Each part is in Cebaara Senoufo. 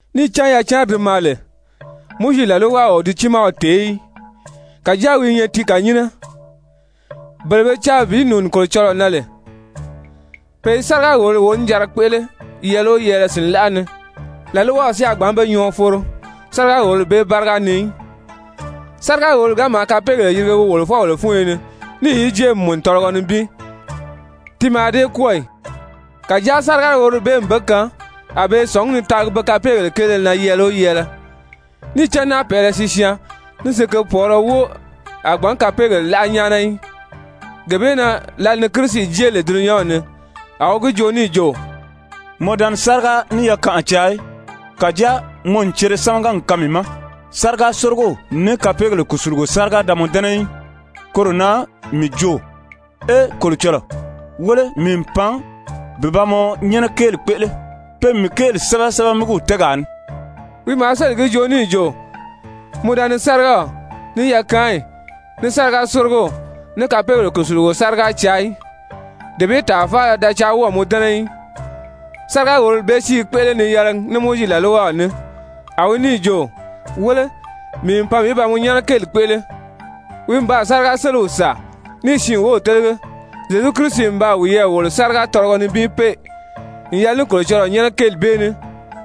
Níì cán yacanri di maa lè, Mowizi làlwaw o di tiimaw tèé í, kàjáa wi i nyɛ ti kànyinnɛ. Bele be caa bi nùuni Kolocɔlɔɔ na lè, pe i sáriga-wòlori wonijanra kpéʔele yɛɛlɛ o yɛɛlɛ sìnlaʔa ni, làlwaw si a gbǎn be nyɔɔ foro sáriga-wòlori bee báriga ni í. Sáriga-wòlori ga maa kapeegèle yirige wi wòlofɔbèle fúnyo ni níì yi jée n mùnu tɔlɔgɔ nibin, ti mǎà dée kwɔ́ɔ ì? Kàjáa sáriga-wòlori bee n be kaan a be i sɔ̀ngí ni taagi be kapeegèle kéele na yɛɛlɛ o yɛɛlɛ. Níì cán náapɛʔɛlɛ sisyaan ní sikepɔɔlɔ wóo a gbǎn kapeegèle láʔa nyáana í. Gee bee na lǎli ni Kirisi jée lè dulunyanw ni, a wi gi joo níì jo: «Mɔ da ni sáriga ní yakanʔa caa í. Kàjáa mɔ n cere sámaga n kaan mii ma. Sáriga-sórigow ní kapeegèle kùsulugo sáriga da mɔ dɛ́nɛ í. Koro na mii jo: ‹Ee Kolocɔlɔɔ, wéle mii n pan bi ba mɔ nyɛ́nɛ kéeli kpéʔele, pe n mii kéeli sɛ́bɛ sɛ́bɛmigiw tɛ́ɛgaa ni.›» Wi maa sélì gi joo níì jo: «Mɔ da ni sárigaw, ní yakaanyi, ní sáriga-sórigow, ní kapeegèle kùsulugo sáriga caa í, dee bee tàa faala da caa wɔ́ɔ̀ mɔ dɛ́nɛ í.» Sáriga-wòlori bee si i kpéʔele ni yɛlɛgi ní Mowizi làlwaw ní. A wi níì jo: «Wéle, mii n pan bi ba mɔ nyɛ́nɛ kéeli kpéʔele.» Wi n baa sáriga-séliw sàa níì siin wów télege. Zyezu Kirisi n baa wiyɛɛ wòlo sáriga tɔlɔgɔ nibin pée n yɛlɛ ní Kolocɔlɔɔ nyɛ́nɛ kéeli bee ní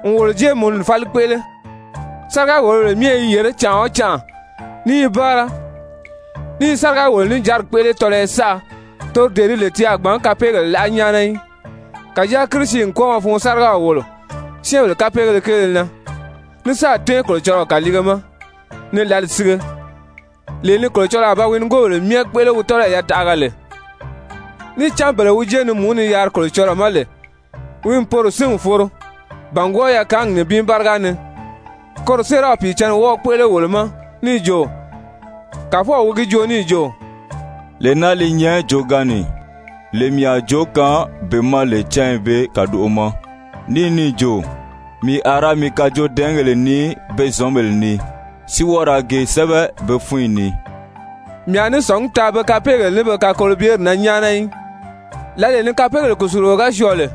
n wolo jéemununi fáli kpéʔele. Sáriga-wòlobèle myɛ i yèré canʔa o canʔa, ní i báara, ní i sáriga-wòlo-níjanri kpéʔele tɔlɔyɔ saʔa, toro dee di lè ti a gbǎn kapeegèle láʔa nyáana í. Kàjáa Kirisi n kwɔ́ɔmɔ fun sárigaw wòlo syɛ́ɛnbèle kapeegéle kéele na, ní sáà tɛ́ɛn Kolocɔlɔɔ kàliige ma ni lǎli sige, lee ni Kolocɔlɔɔ a ba wi nigoobèle myɛ kpéʔele wi tɔ́lɔyi yataʔaga lè. Níì cán bele wi jé ni mùú ni yaari Kolocɔlɔɔ ma lè, wi n bele bee sín n foro bàngwɔɔ yakaangi nibin báriga ni. Koro séeraw Pìicǎnni wɔ́ɔ̀ kpéʔele wolo ma níì jo: «Kàfɔw wi gi joo níì jo: ‹Lee naa li nyɛ joogaanni, lee mii a joo kaan be ma lè cányi bee kàdoʔo ma.› Ní níì jo: ‹Mii a ra mii kajoodɛɛngèle nii pe zɔ̌nbèle ni, si wɔ́ɔ ra ge sɛ́bɛ be fúnyi ni. Mii a ní sɔ̀ngí taa be kapeegèle ní be kakolobyeri na nyáana í.›» Lǎlee ni kapeegèle kùsulugo ga syɔɔ lè,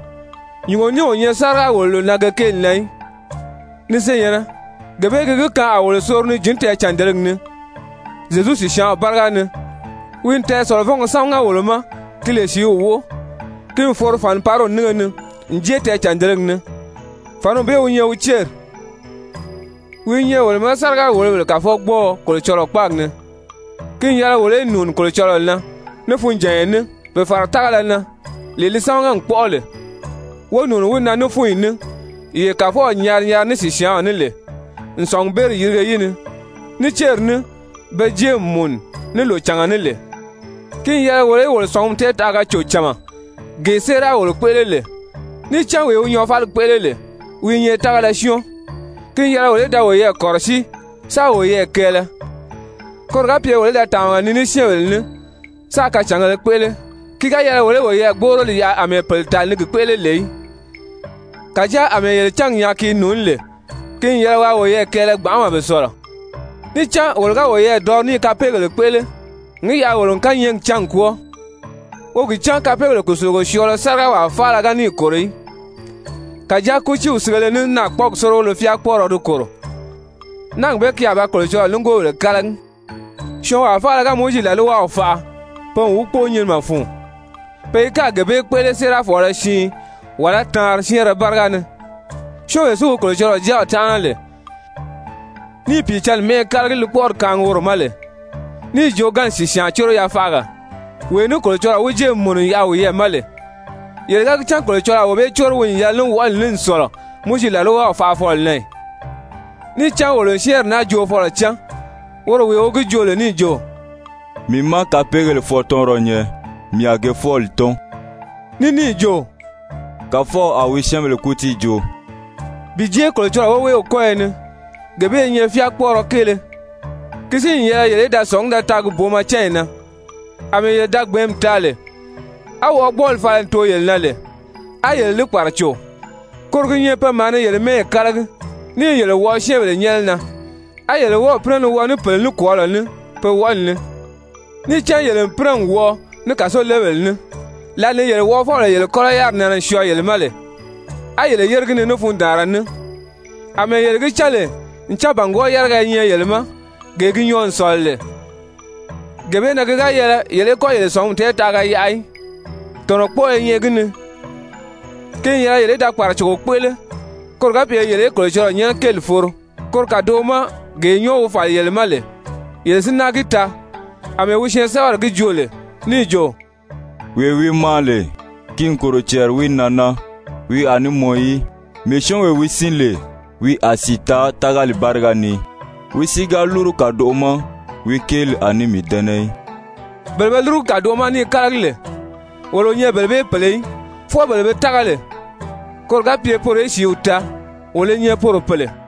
nyùngo ní o nyɛ sáriga-wòloro na ge kéeli na í. Ni senyɛ̀nnɛ, gee bee gi gi kaan a wolo soro ni jǐn tɛɛcàndelegi ni Zyezu sìsyaanw báriga ni. Wi n tɛɛsɔ̀lɔvɔngɔ sámaga wolo ma ki lè sìíw wóʔo, ki n foro fànipariw nínge ni n jée tɛɛcàndelegi ni, fàniw bee wi nyɛ wi céri. Wi i nyɛ wolo ma sáriga-wòlobèle kàfɔgbɔɔɔ Kolocɔlɔɔ kpáagi ni. Ki n yɛlɛ wolo í nùuni Kolocɔlɔɔ na ní funjànya ní, bi fàra tágala na, lee li sámaga n kpɔ́ʔɔ lè, wo nùuni wi na ní fúnyi ní, yee Kàfɔw nyari nyari ní wi sìsyaanw ní lè n sɔ̀ngubeeri yirige yi ni, ní céri ní be jée n mùnu ní lòcànga ní lè. Ki n yɛlɛ wolo í wolo sɔ̀ngumi tɛɛtaʔaga cò cama, gee séera wolo kpéʔele lè, níì cán wee wi nyɔɔfaligi kpéʔele lè, wi i nyɛ tágala syɔ́ɔn. Ki n yɛlɛ wolo í da woyɛɛ kɔ̀rɔsíi, sáā woyɛɛ kɛɛlɛ, koro ga pye wolo í da tàmaga nii ní syɛ́ɛnbèle ní, sáā kacàngēle kpéʔele. Ki ga yɛlɛ wolo í woyɛɛ gbóʔoroli yaʔa àmɛɛ pèle tàli ni gi kpéʔele lè í, kàjáa àmɛɛ yele cángi nyaa ki i nùuní lè, ki n yɛlɛ waa woyɛɛ kɛɛlɛ gbanʔama bi sɔ̀lɔ. Níì cán wolo ga woyɛɛ dɔri ní i kapeegèle kpéʔele n gi yaʔa wolo n kányɛɛgi cán n kwɔ́ɔ, wo gi cán kapeegèle kùsulugo syɔɔlɔ sárigawaa faala ga níì kòro í. Kàjáa kútiiw sigele ní naakpɔɔgi sórigolo fyáakpɔɔrɔ di kòro, náagi bee ki a ba Kolocɔlɔɔ nigoobèle kálagi! Syɔɔnwaa faala ga Mowizi làlwaw faʔa, pe n wi kpóo nyinimɛ fun, pe i gáà gee bee kpéʔele séerafɔɔlɔ siin wàlá taanri syɛ́ɛnrɛ báriga ni. Syɔ́ɔnwee si wi Kolocɔlɔɔ Jáaw tánʔana lè, níì Pìicǎnni mɛ́ʔɛ kálagi li kpɔ́ʔɔri kaangi woro ma lè, níì joogaanni sìsyaan córo yafaʔaga, wee ní Kolocɔlɔɔ wi jée n mùnu n yaʔa wiyɛɛ ma lè, yele ga gi cán Kolocɔlɔɔ a wee bee córo wi n yɛlɛ ní wɔʔɔli ní n sɔ̀lɔ Mowizi làlwaw faʔafɔlɔ na ì? Níì cán wolo n syɛ́ɛnri naa joofɔlɔ cán, woro wee wi gi joo lè níì jo: «Mii má kapeegèle fwɔɔtɔnrɔ nyɛ, mii a ge fwɔ́ɔli tɔ́n.» Ní níì jo: «Kàfɔw a wi syɛ́ɛnbèle kútii joo.» Bi jée Kolocɔlɔɔ woweew kɔ́yɔ ni, gee bee i nyɛ fyáakpɔɔrɔ kéele! Ki si n yɛlɛ yele í da sɔ̀ngí da taagi booma cányi na, àmɛɛ yele da gbɛ̀ɛ́nmi taa lè, á wɔʔɔgbɔɔli fala n too yele na lè, á yele li kpàraco, koro gi nyɛ pe maa ni yele mɛ́ɛyi kálagi ní i yele wɔʔɔ syɛ́ɛnbèle nyɛ́nɛ na, á yele wɔ́ɔ̀ pínɛ ni wɔʔɔ ní pèle nikwɔɔlɔ ní pe wɔʔɔli ni. Níì cán yele n pínɛ n wɔʔɔ ní kàsolebèle ní, lǎli ni yele wɔʔɔfɔbèle yele kɔ́lɔ yáriri nɛnɛ n syɔɔ yele ma lè, a yele yére gi ni ní fundaanra ní, àmɛɛ yele gi cán lè ncan bàngwɔɔ yáriga i nyɛ yele ma, gee gi nyɔɔ n sɔ̀lɔ lè. Gee bee na ki ga yɛlɛ yele í kɔ́ yele sɔ̀ngumi tɛɛtaʔaga yaʔa í, tɔ̀nɔkpɔɔɔ i nyɛ gi ni! Ki n yɛlɛ yele í da kpàracogo kpéʔele koro ga pye yele í Kolocɔlɔɔ nyɛ́nɛ kéeli foro, koro kàdoʔo ma, gee nyɔ́ɔ wi fàli yele ma lè, yele si náa gi taa àmɛɛ wi syɛɛnsɛbɛri gi joo lè níì jo: «Wee wi maa lè, ki n kòro cɛɛri wi nan naa! Wi a ní mɔn í. Mii syɔ́ɔnwee wi sín lè, wi a sìi taa tágali báriga ni. Wi si ga lúru kàdoʔo ma, wi kéeli a ní mii dɛ́nɛ í.» Bele be lúrugu kàdoʔo ma ní i kálagi lè, wolo o nyɛ bele bee pèle í, fwɔɔ bele be tága lè, koro ga pye poro í sìíw taa, wolo i nyɛ poro pèle.